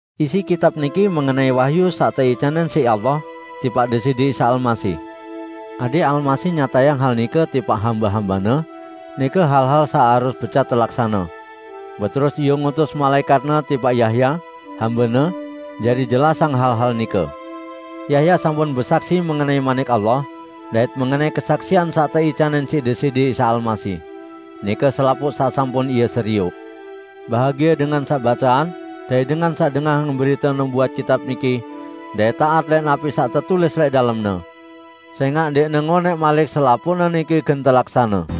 Isi kitab niki mengenai wahyu saq teicanin siq Allah tipaq Deside Isa Almasih. Adẽq Almasih nyatayang hal nike tipaq hambe-hambe-Ne, nike hal-hal saq harus becat telaksane. Beterus Ie ngutus malaẽkat-Ne tipaq Yahya, hambe-Ne, jari jelasang hal-hal nike. Yahya sampun besaksi mengenai Manik Allah dait mengenai kesaksian saq teicanin siq Deside Isa Almasih, nike selapuq saq sampun ie serioq. Bahagie dengan saq baceang dait dengan saq dengahang berite nubuat kitab niki dait taat lẽq napi saq tetulis lẽq dalemne. Sẽngaq ndẽqne ngonẽq malik selapuqne niki gen telaksane.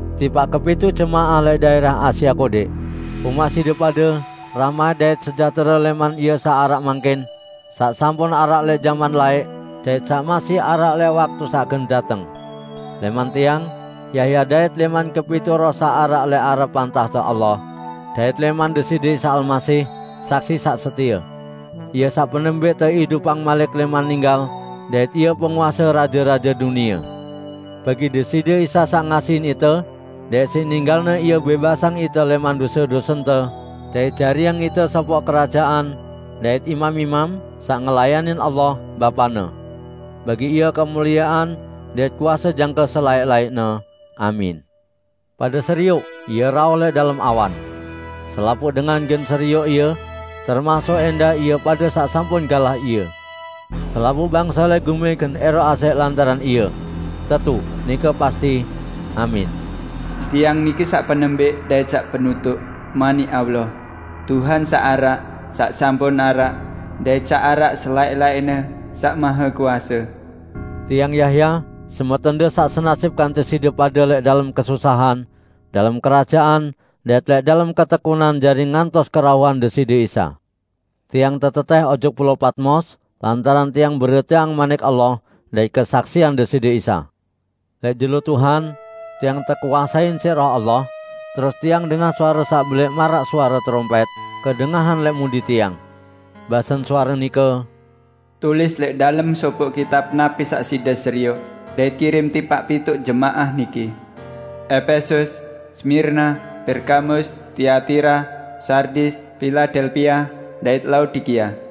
Tipaq kepituq jemaah lẽq daẽrah Asia Kodẽq. Umaq side pade rahmat dait sejahtere lẽman Ie saq araq mangkin, saq sampun araq lẽq jaman laẽq, dait saq masih araq lẽq waktu saq gen dateng. Lẽman tiang, Yahya dait lẽman kepituq roh saq araq lẽq arepan tahte Allah, dait lẽman Deside Isa Almasih, saksi saq setie. Ie saq penembẽq teidupang malik lẽman ninggal dait Ie penguase raje-raje dunie. Bagi Deside Isa saq ngasihin ite, dait siq ninggal-Ne Ie bẽbasang ite lẽman dose-dosente dait jariang ite sopoq kerajaan dait imam-imam, saq ngelayanin Allah, Bapa-Ne. Bagi Ie kemuliean dait kuase jangke selaẽq-laẽqne. Amin! Pade serioq Ie rauh lẽq dalem awan! Selapuq dengan gen serioq Ie, termasuk ẽndah ie pade saq sampun galah Ie. Selapuq bangse lẽq gumi gen ẽroq asẽq lantaran Ie. Tetu, nike pasti! Amin! "Tiang niki saq penembẽq dait saq penutuq, Manik Allah, Tuhan saq araq, saq sampun araq, dait saq araq selaẽq-laẽqne, Saq Mahekuase." Tiang Yahya, semetonde saq senasip kance side pade lẽq dalem kesusahan, dalem kerajaan dait lẽq dalem ketekunan jari ngantos kerauhan Deside Isa. Tiang tetetẽh ojok Pulao Patmos lantaran tiang beriteang Manik Allah dait kesaksian Deside Isa. Lẽq jelo Tuhan, tiang tekuasein siq Roh Allah, terus tiang dengah suare saq belẽq -- maraq suare terompẽt -- kedengahan lẽq mudi tiang. Basen suare nike, "Tulis lẽq dalem sopoq kitab napi saq side serioq, dait kirim tipaq pituq jemaah niki: Epesus, Smirna, Pergamus, Tiatira, Sardis, Piladelpia, dait Laodikia."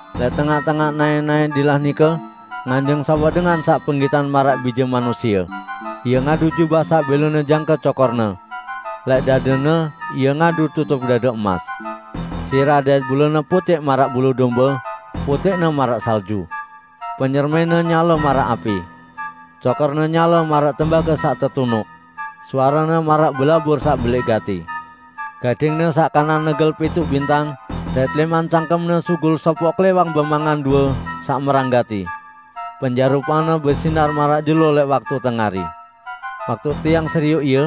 Lẽq tengaq-tengaq naẽ-naẽ dilah nike nganjeng sopoq dengan saq penggitan maraq Bije Manusie. Ie ngadu jubah saq bẽlone jangke cokor-Ne. Lẽq dade-Ne Ie ngadu tutup dade emas. Sirah dait bulu-Ne putẽq maraq bulu dombe, putẽqne maraq salju. Penyermin-Ne nyale maraq api. Cokor-Ne nyale maraq tembage saq tetunuq. Suare-Ne maraq belabur saq belẽq gati. Gading-Ne saq kanan negel pituq bintang, dait lẽman cangkem-Ne sugul sopoq klẽwang bemangan due saq merang gati. Penjarupan-Ne besinar maraq jelo lẽq waktu tengari. Waktu tiang serioq Ie,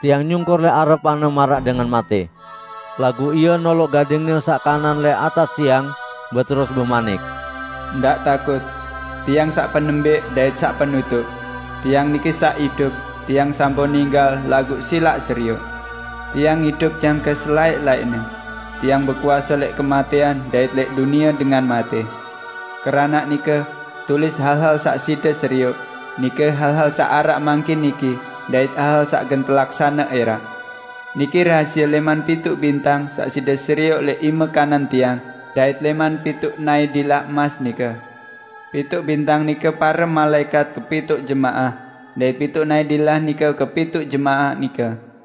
tiang nyungkur lẽq arepan-Ne maraq dengan matẽ. Laguq Ie noloq gading-Ne saq kanan lẽq atas tiang beterus bemanik, "Ndaq takut! Tiang saq penembẽq dait saq penutuq. Tiang niki saq idup! Tiang sampun ninggal, laguq silaq serioq; Tiang idup jangke selaẽq-laẽqne. Tiang bekuase lẽq kematẽan, dait lẽq dunie dengan matẽ. Keranaq nike, tulis hal-hal saq side serioq, nike hal-hal saq araq mangkin niki, dait hal-hal saq gen telaksane ẽraq. Niki rahasie lẽman pituq bintang saq side serioq lẽq ime kanan Tiang, dait lẽman pituq naẽ dilah emas nike: Pituq bintang nike pare malaẽkat kepituq jemaah, dait pituq naẽ dilah nike kepituq jemaah nike."